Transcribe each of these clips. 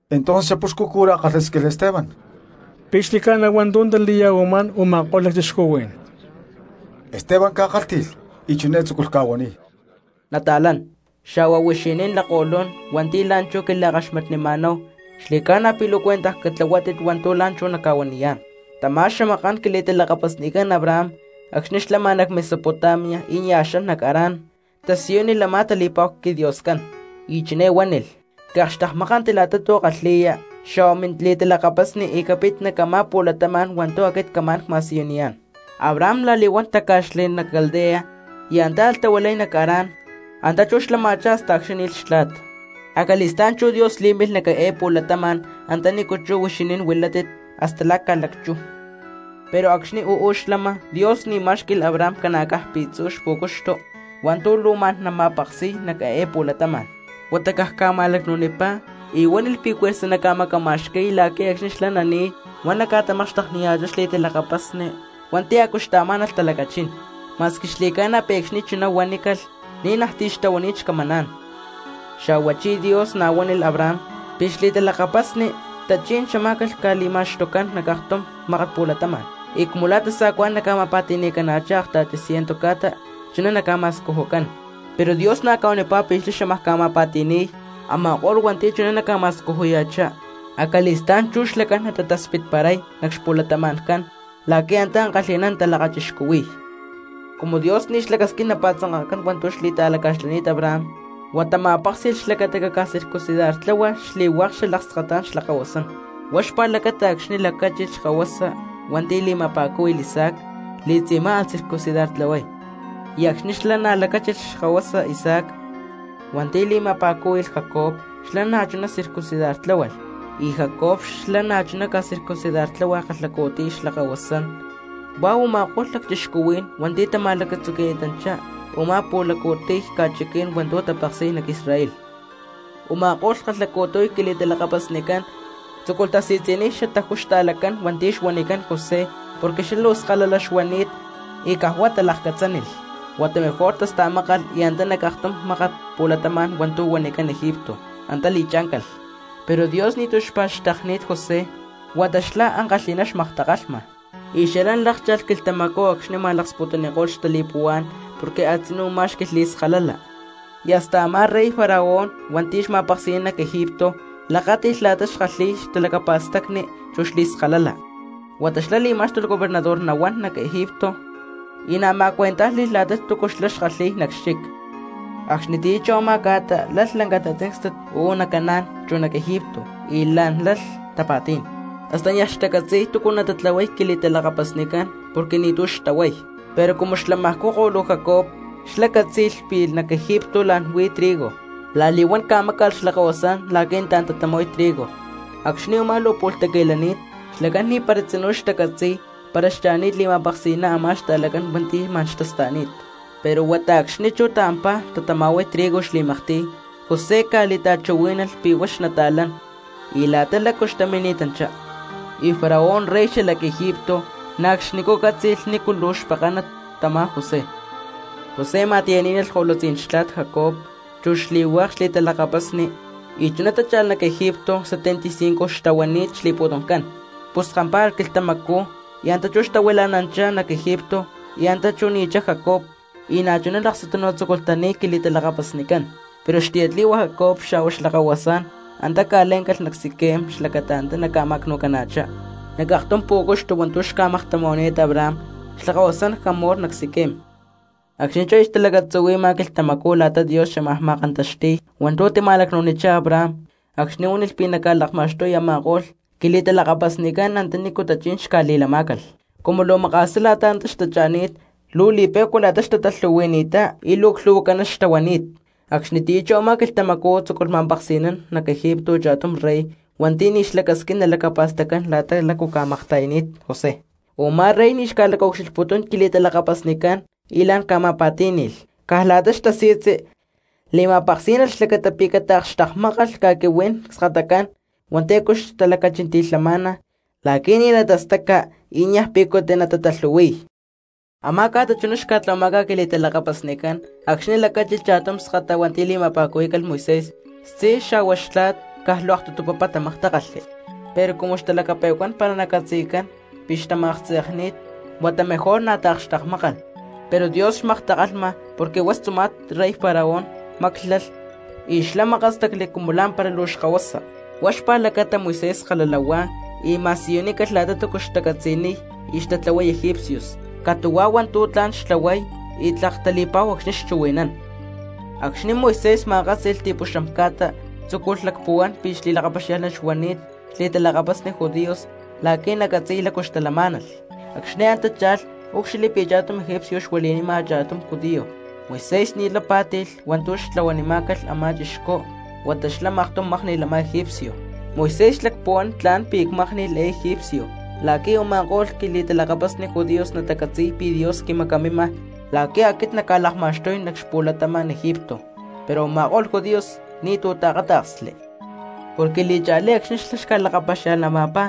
Entonces xapuxcu cura kalhásquilh Esteban: —¿Pi̠ xli̠ca̠na hua̠ntu̠ tali̠ya̠huamá̠n u̠ma̠ko̠lh lacchixcuhuí̠n? Esteban ca̠kálhti̠lh y chiné tzúculh ca̠huaniy: —Nata̠lán xa̠hua huixinín lakko̠lún hua̠nti̠ la̠nchú quila̠kaxmatnima̠náhu, xli̠ca̠na pi̠ luu cuentaj catlahuátit hua̠ntu̠ la̠nchú nacca̠huaniyá̠n: Tamá xamaká̠n quili̠talakapasnicán Abraham acxni̠ xlama nac Mesopotamia y nia̠ xan nac Harán, tasiyúnilh a̠má tali̠pa̠hu quiDioscán, y chiné huánilh: “Caakxtekmákanti la̠ta tu̠ kalhi̠ya xa̠hua mili̠talakapasni, y capit nac a̠má pu̠latama̠n hua̠ntu̠ aquit cámaj ma̠siyuniyá̠n.” Abraham la̠li̠huán táca̠xli nac Caldea y antá alh tahuilay nac Harán; antá chú xlama̠chá hasta acxni̠ ni̠lh xtla̠t, acali̠stá̠n chú Dios lí̠milh nac eé pu̠latama̠n antanícu chú huixinín huilátit la̠ ca̠lacchú. Pero acxni̠ uú xlama, Dios ni̠ má̠xqui̠lh Abraham ca̠na̠caj pi̠tzu̠ xpu̠cuxtu hua̠ntu̠ luu ma̠n nama̠peksi̠y nac eé pu̠latama̠n, huata caj ma̠lacnu̠nipá y huánilh pi̠ juerza namacama̠xqui̠y, la̠qui̠ acxni̠ xlá nani̠y huá naca̠tamakxtekniya̠chá xli̠talakapasni hua̠nti̠ a̠cu xtaamá̠nalh talacachín; ma̠squi xli̠ca̠na pi̠ acxni̠ chuná huanícalh ni̠najti̠ xtahuani̠t xcamancán. Xa̠huachí Dios na̠ huánilh Abraham pi̠ xli̠talakapasni tachí̠n xamá̠calh ca̠li̠ma̠xtucán nac aktum mákat pu̠latama̠n y cumu la̠ tasa̠cuá̠n naca̠ma̠pa̠ti̠ni̠cana̠chá akta̠ti ciento ca̠ta chuná naca̠ma̠scujucán. Pero Dios na̠ huanipá pi̠ xlá xámaj ca̠ma̠pa̠ti̠ni̠y a̠ma̠ko̠lh cristianos hua̠nti̠ chuná naca̠ma̠scujuya̠chá, acali̠stá̠n chú xlacán natataspitparay nac xpu̠latama̠ncán la̠qui̠ antá ankalhi̠ná natalakachixcuhui̠y. Cumu Dios ni̠ xlacasquín napa̠tzanka̠cán hua̠ntu̠ xlá xli̠ta̠laca̠xlani̠t Abraham, huata ma̠péksi̠lh xlacata pi̠ caca̠circuncidartláhualh xli̠hua̠k xalakskatá̠n xlakahuasancán; huá xpa̠lacata acxni̠ lacáchilh xkahuasa hua̠nti̠ li̠ma̠pa̠cúhui̠lh Isaac li̠tzi̠má alh circuncidartlahuay. Y acxni̠ xlá na̠ lacáchilh xkahuasa Isaac hua̠nti̠ li̠ma̠pa̠cúhui̠lh Jacob xlá na̠chuná circuncidartláhualh; y Jacob xlá na̠chuná ca̠circuncidartláhualh kalhacu̠tiy xlakahuasán huá u̠ma̠ko̠lh lacchixcuhuí̠n hua̠nti̠ tama̠lacatzuqui̠ni̠tanchá a̠má pu̠laccu̠tiy ca̠chiquí̠n hua̠ntu̠ tapeksi̠y nac Israel. ’Uma̠ko̠lh kalhacu̠tiy quili̠talakapasnicán tzúculh tasi̠tzi̠niy xatajú xta̠lacán hua̠nti̠ xuanicán José porque xlá luu skalala xuani̠t y caj huá talakcatzánilh, huata mejor tásta̠mákalh y antá nac aktum mákat pu̠latama̠n hua̠ntu̠ huanicán Egipto antá li̠chá̠ncalh; pero Dios ni̠tu̠ xpa̠xtekni̠t José huata xlá ankalhi̠ná xmaktakalhma. Y xalán lákcha̠lh quilhtamacú acxni̠ ma̠laksputuniko̠lh xtali̠puhuá̠n porque a̠tzinú má̠xqui̠lh xli̠skalala, y hasta a̠má rey Faraón hua̠nti̠ xma̠peksi̠nán nac Egipto lakáti̠lh la̠ta xkalhíy xtalacapa̠stacni chu xli̠skalala, huata xlá li̠má̠xtulh gobernador nahuán nac Egipto y na̠ ma̠cuentájli̠lh la̠ta túcu xlá xkalhi̠y nac xchic. ’Acxnitiyá chú a̠má ca̠ta lalh lanca tatzíncstat uú nac Canaan chu nac Egipto y la̠n lalh tapa̠tí̠n, hasta niaj xtacatzi̠y túcu natatlahuay quili̠talakapasnicán porque ni̠tu̠ xtahuay. Pero cumu xlamajcú ko̠lu Jacob xlá cátzi̠lh pi̠ nac Egipto la̠n xuí trigo, la̠li̠huán ca̠máca̠lh xlakahuasán la̠qui̠ nataán tatama̠huay trigo. Acxni̠ u̠má luu pu̠lh taqui̠lani̠t xlacán ni̠para tzinú xtacatzi̠y para xcha̠ni̠t li̠ma̠peksi̠ná a̠má xta̠lacán hua̠nti̠ ma̠n xtasta̠ni̠t, pero huata acxni̠ chú taampaj tatama̠huay trigo xli̠maktiy José ca̠li̠ta̠chuhuí̠nalh pi̠ huá xnata̠lán y la̠ta lácu xmini̠tanchá; y Faraón rey xalac Egipto na̠ acxnicú cátzi̠lh nícu luu xpekánat tamá José. José ma̠tiyá̠nalh ko̠lutzí̠n xtla̠t Jacob chu xli̠hua̠k xli̠talakapasni, y chuná tácha̠lh nac Egipto setenta y cinco xtahuani̠t xli̠pu̠tumcán. Pus kampá̠alh quilhtamacú y antá chú xtahuila̠nanchá nac Egipto, y antá chú ni̠chá Jacob y na̠chuná laksutunu tzúculh tani̠y quili̠talakapasnicán. Pero xtiyatli̠hua Jacob xa̠hua xlakahuasán antá xca̠le̠ncán nac Siquem xlacata antá naca̠ma̠cnu̠cana̠chá nac aktum pú̠cuxtu hua̠ntu̠ xca̠maktama̠huani̠t Abraham xlakahuasán Hamor nac Siquem. ’Acxni̠ chú aya xtalacatzuhui̠ma quilhtamacú la̠ta Dios xámaj ma̠kantaxti̠y hua̠ntu̠ tima̠lacnu̠nichá Abraham acxni̠ huánilh pi̠ naca̠lakma̠xtuy a̠ma̠ko̠lh quili̠talakapasnicán antanícu tachí̠n xca̠li̠lamá̠calh, cumu luu maka̠sá la̠ta antá xtacha̠ni̠t luu li̠pe̠cua la̠ta xtatalhu̠hui̠ni̠ttá y luu clhu̠huacaná xtahuani̠t. Acxnitiyá chú a̠má quilhtamacú tzúculh ma̠peksi̠nán nac Egipto cha̠tum rey hua̠nti̠ ni̠ xlacasquín nalacapa̠staccán la̠ta lácu xca̠makta̠yani̠t José. Umá rey ni̠ xca̠lacaucxilhputún quili̠talakapasnicán y la̠n ca̠ma̠pa̠tí̠ni̠lh, caj la̠ta xtasi̠tzi li̠ma̠peksí̠nalh xlacata pi̠ cataakxtekmákalh ca̠quihuí̠n cskatacán hua̠nti̠ a̠cu lacachinti̠lhama la̠qui̠ ni̠ natastaca y nia̠ picuta natatalhu̠hui̠y. Amá ca̠ta chuná xca̠tlahuamá̠calh quili̠talakapasnicán acxni̠ lacáchilh cha̠tum skata hua̠nti̠ li̠ma̠pa̠cuhuí̠calh Moisés. Xtzí xa̠hua xtla̠t caj luu aktutu papá tamaktákalhli. Pero cumu xtalaklhpe̠cuán para nacatzi̠cán pi̠ xtama̠tze̠kni̠t huata mejor na̠ taakxtekmákalh. Pero Dios xmaktakalhma, porque huá xtzuma̠t rey Faraón máclalh y xlá makástacli cumu la̠mpara luu xkahuasa. Huá xpa̠lacata Moisés skalala huá y na̠ ma̠siyunícalh la̠ta túcu xtacatzi̠niy y xtatlahuay egipcios, catu̠huá hua̠ntu̠ tla̠n xtlahuay y tlak tali̠pa̠hu acxni̠ xchuhui̠nán. ’Acxni̠ Moisés ma̠kátzi̠lh xti̠puxam ca̠ta tzúculh lacpuhuán pi̠ xli̠lakapaxiá̠lhnat xuani̠t xli̠talakapasni judíos la̠qui̠ nacatzi̠y lácu xtalamá̠nalh. Acxni̠ antá cha̠lh úcxilhli pi̠ cha̠tum egipcio xuili̠nima cha̠tum judío, Moisés ni̠lay pá̠tilh hua̠ntu̠ xtlahuanimá̠calh a̠má chixcú huata xlá maktum mákni̠lh a̠má egipcio. Moisés xlacpuhuán: “Tla̠n pi̠ cmákni̠lh eé egipcio la̠qui̠ u̠ma̠ko̠lh quili̠talakapasni judíos natacatzi̠y pi̠ Dios quimacamima la̠qui̠ aquit nacca̠tamacxtuy nac xpu̠latama̠n Egipto.” Pero a̠ma̠ko̠lh judíos ni̠tu̠ taakáta̠ksli. Porque li̠cha̠lí acxni̠ xlá ca̠lakapaxia̠lhnampá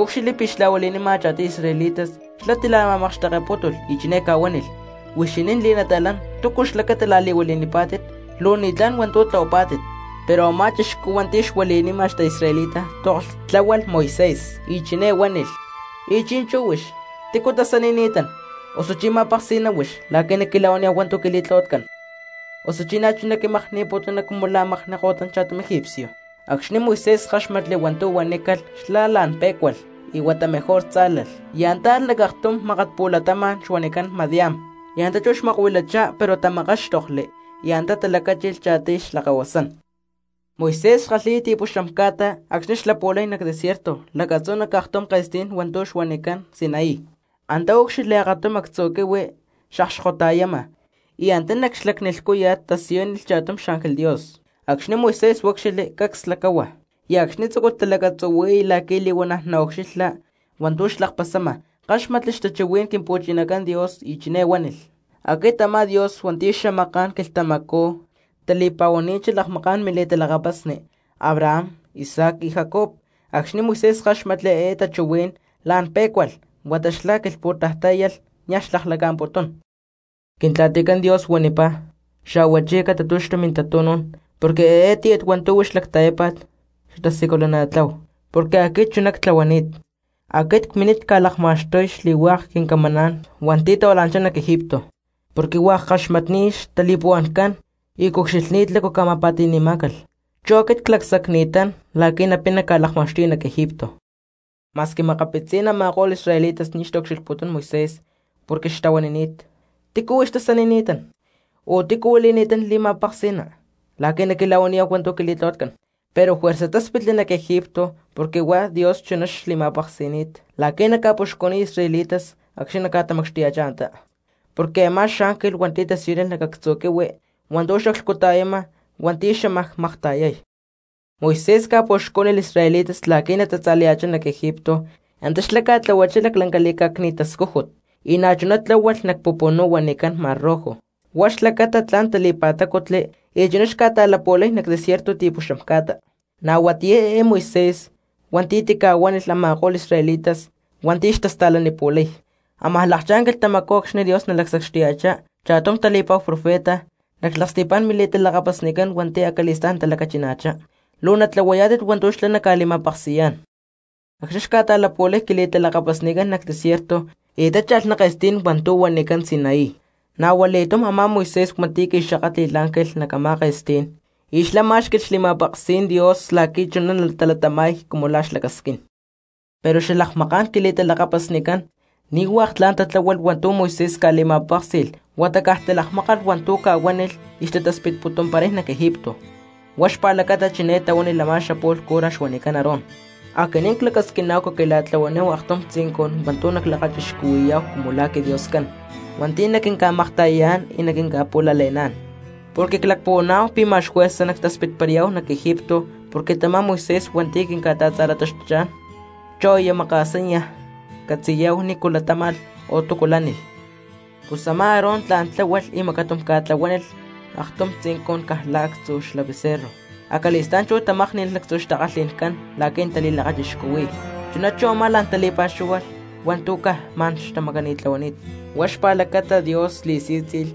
úcxilhli pi̠ xla̠huili̠nima cha̠tiy israelitas xlá tila̠ma̠makxtekepútulh y chiné ca̠huánilh: “Huixinín li̠nata̠lán, ¿túcu xlacata la̠li̠huili̠nipá̠tit? Luu ni̠tlá̠n hua̠ntu̠ tlahuapá̠tit.” Pero a̠má chixcú hua̠nti̠ xuili̠nima xta̠israelita toklh tláhualh Moisés y chiné huánilh: “Y chi̠nchú huix ¿tícu tasanini̠tán? ¿Osuchí ma̠peksi̠ná huix la̠qui̠ naquila̠huaniyá̠hu hua̠ntu̠ quili̠tlahuatcán? ¿Osuchi na̠chuná quimakni̠putuna cumu la̠ makni ko̠tan cha̠tum egipcio?” Acxni̠ Moisés káxmatli hua̠ntu̠ huanícalh xlá la̠n pé̠cualh y huata mejor tzá̠lalh, y antá alh nac aktum mákat pu̠latama̠n xuanicán Madián; y antá chú xmakuilachá pero tamakáxtokli y antá talacáchilh cha̠tiy xlakahuasán. ’Moisés xkalhi̠y ta̠tipuxam ca̠ta acxni̠ xlapu̠lay nac desierto lacatzú nac aktum ke̠stí̠n hua̠ntu̠ huanicán Sinaí. Antá úcxilhli akatum actzu̠ quihui xakxkota̠yama, y antá nac xlacni lhcúya̠t tasiyúnilh cha̠tum xángel Dios. Acxni̠ Moisés úcxilhli cacs lacáhua, y acxni̠ tzúculh talacatzuhui̠y la̠qui̠ li̠huana̠ naucxilha hua̠ntu̠ xlakpasama káxmatli xtachuhuí̠n Quimpu̠chinacán Dios, chiné huánilh: “Aquit a̠má Dios hua̠nti̠ xamaká̠n quilhtamacú tali̠pa̠huani̠t xalakmaká̠n militalakapasni Abraham, Isaac y Jacob.” Acxni̠ Moisés káxmatli eé tachuhuí̠n la̠n pé̠cualh huata xlá quilhpu̠taj tá̠yalh y niaj xlaklaca̠mputún. Quintla̠ticán Dios huanipá: “Xa̠huachí catatu̠xtu mintatu̠nú̠n porque eé tíyat hua̠ntu̠ huix lacta̠yápa̠t xatasiculana̠tlahuá porque aquit chuná ctlahuani̠t. Aquit cmini̠t ca̠lakma̠xtuy xli̠hua̠k quincamaná̠n hua̠nti̠ tahuila̠nanchá nac Egipto porque hua̠k ckaxmatni̠t xtali̠puhua̠ncán y cucxilhni̠t la̠ta lácu ca̠ma̠pa̠ti̠má̠calh, chu aquit clacsacni̠tán la̠qui̠ napina ca̠lakma̠xtuya nac Egipto.” ’Ma̠squi makapitzí̠n a̠ma̠ko̠lh israelitas ni̠ xtaucxilhputún Moisés porque xtahuanini̠t: “¿Tícu huix tasanini̠tán? ¿O tícu huili̠ni̠tán li̠ma̠peksi̠ná la̠qui̠ naquila̠huaniyá̠hu hua̠ntu̠ quili̠tlahuatcán?” Pero juerza táspitli nac Egipto porque huá Dios chuná xli̠ma̠peksi̠ni̠t la̠qui̠ naca̠puxcuniy israelitas acxni̠ naca̠tamacxtuya̠chá antá, porque a̠má xángel hua̠nti̠ tasiyúnilh nac actzu̠ quihui hua̠ntu̠ xaclhcuta̠yama hua̠nti̠ xámaj makta̠yay. Moisés ca̠puxcú̠nilh israelitas la̠qui̠ natatza̠laya̠chá nac Egipto, antá xlá ca̠tlahuachá laclanca li̠cá̠cni̠t tascújut, y na̠chuná tláhualh nac pupunú huanicán Mar Rojo, huá xlacata tla̠n tali̠pa̠tácutli y chuná xca̠ta̠lapu̠lay nac desierto ti̠puxam ca̠ta. Na̠ huatiyá eé Moisés hua̠nti̠ tica̠huánilh a̠ma̠ko̠lh israelitas hua̠nti̠ xtasta̠lanipu̠lay: “Amaj lakchá̠n quilhtamacú acxni̠ Dios nalacsacxtuya̠chá chá̠tum tali̠pa̠hu profeta nac xlaksti̠pá̠n mili̠talakapasnicán hua̠nti̠ acali̠stá̠n natalacachina̠chá, luu natlahuayá̠tit hua̠ntu̠ xlá naca̠li̠ma̠peksi̠yá̠n.” Acxni̠ xca̠ta̠lapu̠lay quili̠talakapasnicán nac desierto y tácha̠lh nac ke̠stí̠n hua̠ntu̠ huanicán Sinaí, na̠ hua li̠túm Moisés hua̠nti̠ qui̠xakátli̠lh ángel nac a̠má ke̠stí̠n y xlá má̠xqui̠lh xli̠ma̠peksí̠n Dios la̠qui̠ chuná natalatama̠y cumu xlá lacasquín. ’Pero xalakmaká̠n quili̠talakapasnicán ni̠ hua̠k tla̠n tatláhualh hua̠ntu̠ Moisés ca̠li̠ma̠péksi̠lh huata caj talakmákalh hua̠ntu̠ ca̠huánilh y xtataspitputumparay nac Egipto. Huá xpa̠lacata chiné tahuánilh a̠má xapu̠lh cura xuanicán Aarón: “Aquinín clacasquiná̠hu xquila̠tlahuaníhu aktum tzincun hua̠ntu̠ nalakachixcuhui̠yá̠hu cumu la̠ quiDioscán hua̠nti̠ naquinca̠makta̠yayá̠n y naquinca̠pu̠lale̠ná̠n, porque clacpuhuaná̠hu pi̠ ma̠x juerza nactaspitparayá̠hu nac Egipto porque tamá Moisés hua̠nti̠ quinca̠ta̠tza̠lataxtuchá̠n chú aya maka̠sá niaj catzi̠yá̠hu nícu latáma̠lh o túcu lánilh.” Pus a̠má Aarón tla̠n tláhualh y macatum ca̠tlahuánilh aktum tzincun caj la̠ actzú xla becerro, acali̠stá̠n chú tamákni̠lh lactzu̠ xtakalhi̠ncán la̠qui̠ natali̠lakachixcuhui̠y, chuná chú a̠má la̠n tali̠pa̠xúhualh hua̠ntu̠ caj ma̠n xtamacani̠tlahuani̠t. Huá xpa̠lacata Dios li̠sí̠tzi̠lh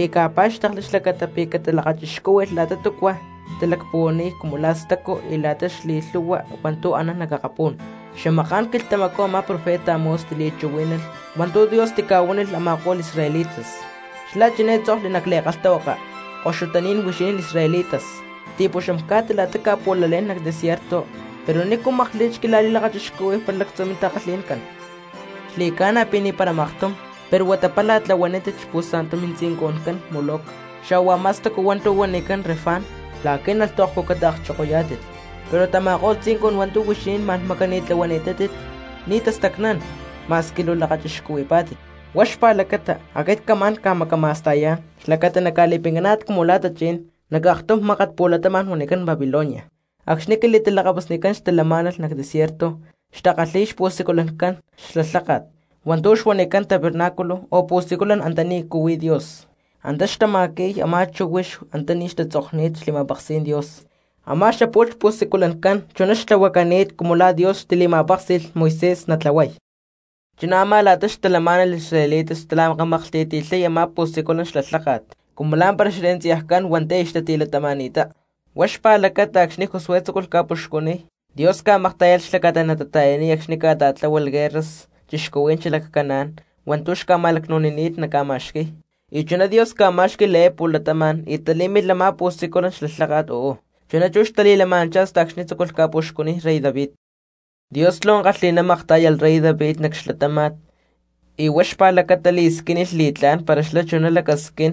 y ca̠pá̠xtekli xlacata pi̠ catalakachixcúhui̠lh la̠ta túcua xtalacpuhuaniy cumu la̠ stacu y la̠ta xli̠lhu̠hua hua̠ntu̠ anán nac akapú̠n. Xamaká̠n quilhtamacú a̠má profeta Amós tili̠chuhuí̠nalh hua̠ntu̠ Dios tica̠huánilh a̠ma̠ko̠lh israelitas, xlá chiné títzokli nac li̠kalhtahuaka: Koxutaní̠n huixinín israelitas, ti̠puxam ca̠ta la̠ta cca̠pu̠lalé̠n nac desierto, pero, ¿nícu makli̠t xquila̠li̠lakachixcuhuí̠hu para lactzu̠ mintakalhi̠ncán? ¡Xli̠ca̠na pi̠ ni̠para maktum! Pero huata pála tlahuanítit xpu̠sa̠ntu mintzincuncán Moloc xa̠hua a̠má stacu hua̠ntu̠ huanicán Renfán, la̠qui̠ naca̠cucata̠kchokoyá̠tit. Pero tama̠ko̠lh tzincun hua̠ntu̠ huixinín ma̠n macani̠tlahuani̠tátit ni̠ tastacnán ma̠squi luu lakachixcuhuipá̠tit. Huá xpa̠lacata aquit camá̠n ca̠macama̠sta̠yá̠n xlacata naca̠li̠pincaná̠tit cumu la̠ tachí̠n nac aktum mákat pu̠latama̠n huanicán Babilonia. ’Acxni̠ quili̠talakapasnicán xtalamá̠nalh nac desierto xtakalhi̠y xpu̠siculancán xla lháka̠t hua̠ntu̠ xuanicán tabernáculo o pu̠siculan antanícu huí Dios, antá xtama̠qui̠y a̠má chíhuix antaní xtatzokni̠t xli̠ma̠peksí̠n Dios; a̠má xapu̠lh xpu̠siculancán chuná xtlahuacani̠t cumu la̠ Dios tili̠ma̠péksi̠lh Moisés natlahuay. Chuná a̠má la̠ta xtalamá̠nalh israelitas xtamakamaklhti̠ti̠lhay a̠má pu̠siculan xla lháka̠t cumu lá̠mpara xherenciajcán hua̠nti̠ aya xtati̠latama̠ni̠ttá, huá xpa̠lacata acxni̠ Josué tzúculh ca̠puxcuniy, Dios ca̠maktá̠yalh xlacata natata̠yaniy acxni̠ tata̠tlahuánilh guerras cristianos xalac Canaan hua̠ntu̠ xma̠lacnu̠ni̠t naca̠ma̠xqui̠y y chuná Dios ca̠má̠xqui̠lh eé pu̠latama̠n y talí̠milh a̠má siculan xla lháka̠t uú; chuná chú xtali̠lama̠nanchá hasta acxni̠ tzúculh ca̠puxcuniy rey David. Dios luu ankalhi̠ná maktá̠yalh rey David nac xlatáma̠t y huá xpa̠lacata li̠squínilh li̠tlá̠n para xlá chuná lacasquín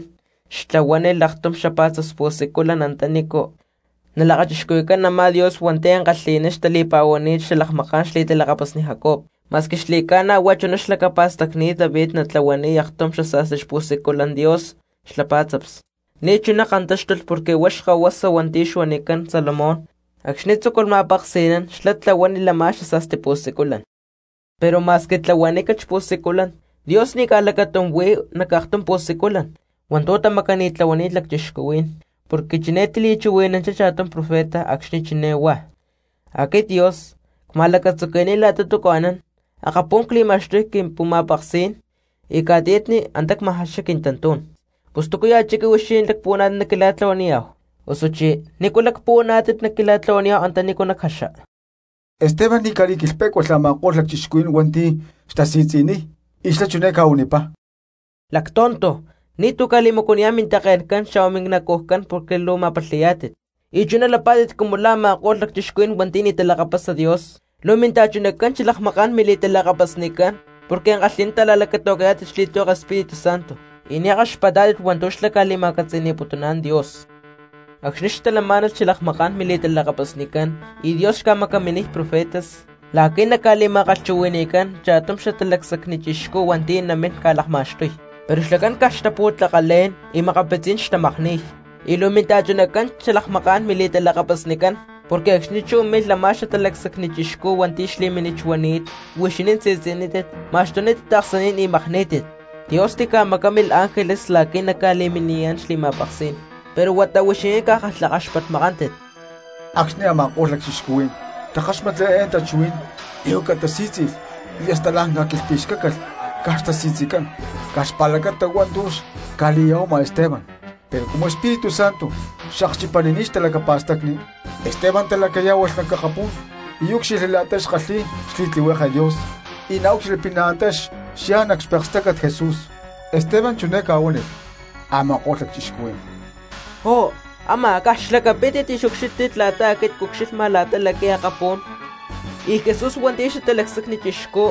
xtlahuánilh aktum xapá̠tzaps xpu̠siculan antanícu nalakachixcuhui̠cán a̠má Dios hua̠nti̠ ankalhi̠ná xtali̠pa̠huani̠t xalakmaká̠n xli̠talakapasni Jacob. Ma̠squi xli̠ca̠na huá chuná xlacapa̠stacni̠t David natlahuaniy aktum xasa̠sti xpu̠siculan Dios xla pá̠tzaps, ni̠ chuná kantáxtulh porque huá xkahuasa hua̠nti̠ xuanicán Salomón acxni̠ tzúculh ma̠peksi̠nán xlá tlahuánilh a̠má xasa̠sti pu̠siculan. Pero ma̠squi tlahuanícalh xpu̠siculan Dios ni̠ caj lacatum huí nac aktum pu̠siculan hua̠ntu̠ tamacani̠tlahuani̠t lacchixcuhuí̠n, porque chiné tili̠chuhui̠nanchá cha̠tum profeta acxni̠ chiné huá: Aquit Dios cma̠lacatzuqui̠ni̠t la̠ta túcu anán, akapún cli̠ma̠xtuy quimpu̠ma̠peksí̠n, y ca̠tiyatni antá cma̠jaxay quintantú̠n. Pus ¿túcuya̠ chiqui huixinín lacpuhuaná̠tit naquila̠tlahuaniyá̠hu? Osuchí ¿nícu lacpuhuaná̠tit naquila̠tlahuaniyá̠hu antanícu nacjaxa? Esteban ni̠ ca̠quilhpe̠cuánilh a̠ma̠ko̠lh lacchixcuhuí̠n hua̠nti̠ xtasi̠tzi̠niy y xlá chiné ca̠huanipá: —¡Lactonto! Ni̠tu̠ ca̠li̠macuaniyá̠n mintake̠ncán xa̠hua minacujcán porque luu ma̠palhi̠yá̠tit, y chuná lapá̠tit cumu la̠ a̠ma̠ko̠lh cristianos hua̠nti̠ ni̠ talakapasa Dios. Luu minta̠chunacán xalakmaká̠n mili̠talakapasnicán porque ankalhi̠ná ta̠la̠lacata̠qui̠yá̠tit xli̠tlihueke Espíritu Santo y ni̠ kaxpatpá̠tit hua̠ntu̠ xlá ca̠li̠ma̠catzi̠ni̠putuná̠n Dios. Acxni̠ xtalamá̠nalh xalakmaká̠n mili̠talakapasnicán y Dios xca̠macaminiy profetas la̠qui̠ naca̠li̠ma̠kalhchuhui̠ni̠cán cha̠tum Xatalacsacni Chixcú hua̠nti̠ namín ca̠lakma̠xtuy, pero xlacán caj xtapu̠tlakalé̠n, y makapitzí̠n xtamakníy; y luu minta̠chunacán xalakmaká̠n mili̠talakapasnicán, porque acxni̠ chú milh a̠má Xatalacsacni Chixcú hua̠nti̠ xli̠mínit xuani̠t huixinín si̠tzi̠nítit ma̠xtunítit taaksaní̠n y makní̠tit. Dios tica̠macámilh ángeles la̠qui̠ naca̠li̠miniyá̠n xli̠ma̠peksí̠n, pero huata huixinín caj kalhakaxpatmakántit. Acxni̠ a̠ma̠ko̠lh lacchixcuhuí̠n takáxmatli eé tachuhuí̠n li̠huaca tasí̠tzi̠lh y hasta la̠n ca̠quilhpi̠xcácalh caj xtasi̠tzicán caj xpa̠lacata hua̠ntu̠ xca̠li̠ya̠huama Esteban. Pero cumu Espíritu Santo xakchipanini̠t xtalacapa̠stacni, Esteban talacayá̠hualh nac akapú̠n úcxilhli la̠ta kalhi̠y xli̠li̠lakáti̠t Dios y na̠ úcxilhli pi̠ antá xyá nac xpekstácat Jesús. Esteban chiné ca̠huánilh a̠ma̠ko̠lh lacchixcuhuí̠n: —¡Jó, a̠má caj xlacapítit y xucxílhtit la̠ta aquit cucxilhma la̠ta laqui̠ akapú̠n y Jesús hua̠nti̠ Xatalacsacni Chixcú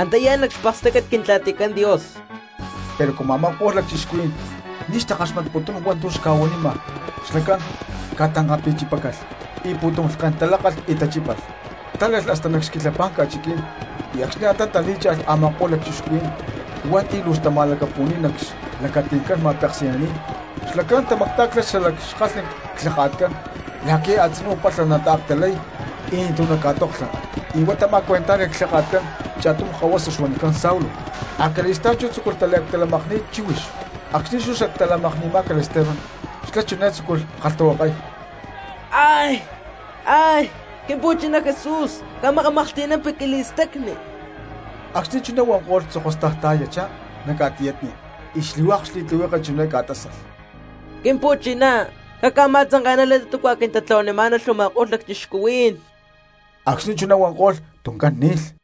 antá yá nac xpekstácat Quintla̠ticán Dios! Pero cumu a̠ma̠ko̠lh lacchixcuhuí̠n ni̠ xtakaxmatputún hua̠ntu̠ xca̠huanima xlacán ca̠tankapi̠chipácalh y pu̠tum lhken talákalh y tachípalh. Tále̠lh hasta nac xquilhapá̠n ca̠chiquí̠n y acxni̠ antá talí̠cha̠lh a̠ma̠ko̠lh lacchixcuhuí̠n hua̠nti̠ luu xtama̠lacapu̠ni̠t nac xlacati̠ncán ma̠peksi̠naní̠n xlacán tamactá̠ctalh xalac xkalhni clhaka̠tcán la̠qui̠ a̠tzinú palha nataactalay y ni̠tu̠ naca̠toklha, y huá tama̠cuentájli̠lh clhaka̠tcán cha̠tum kahuasa xuanicán Saulo, acali̠stá̠n chú tzúculh taliactalamakni̠y chíhuix. Acxni̠ chú xactalamakni̠má̠calh Esteban xlá chiné tzúculh kalhtahuakay: —¡Quimpu̠chiná Jesús, camakamaklhti̠nampi quili̠stacni! Acxni̠ chuná huanko̠lh tzokostaj ta̠yachá nac ca̠tiyatni y xli̠hua̠k xli̠tlihueke chiné ca̠tásalh: —¡Quimpu̠chiná, caca̠ma̠tzanke̠nani la̠ta túcua quintlahuanimá̠nalh u̠ma̠ko̠lh lacchixcuhuí̠n! Acxni̠ chuná huanko̠lh tuncán ni̠lh.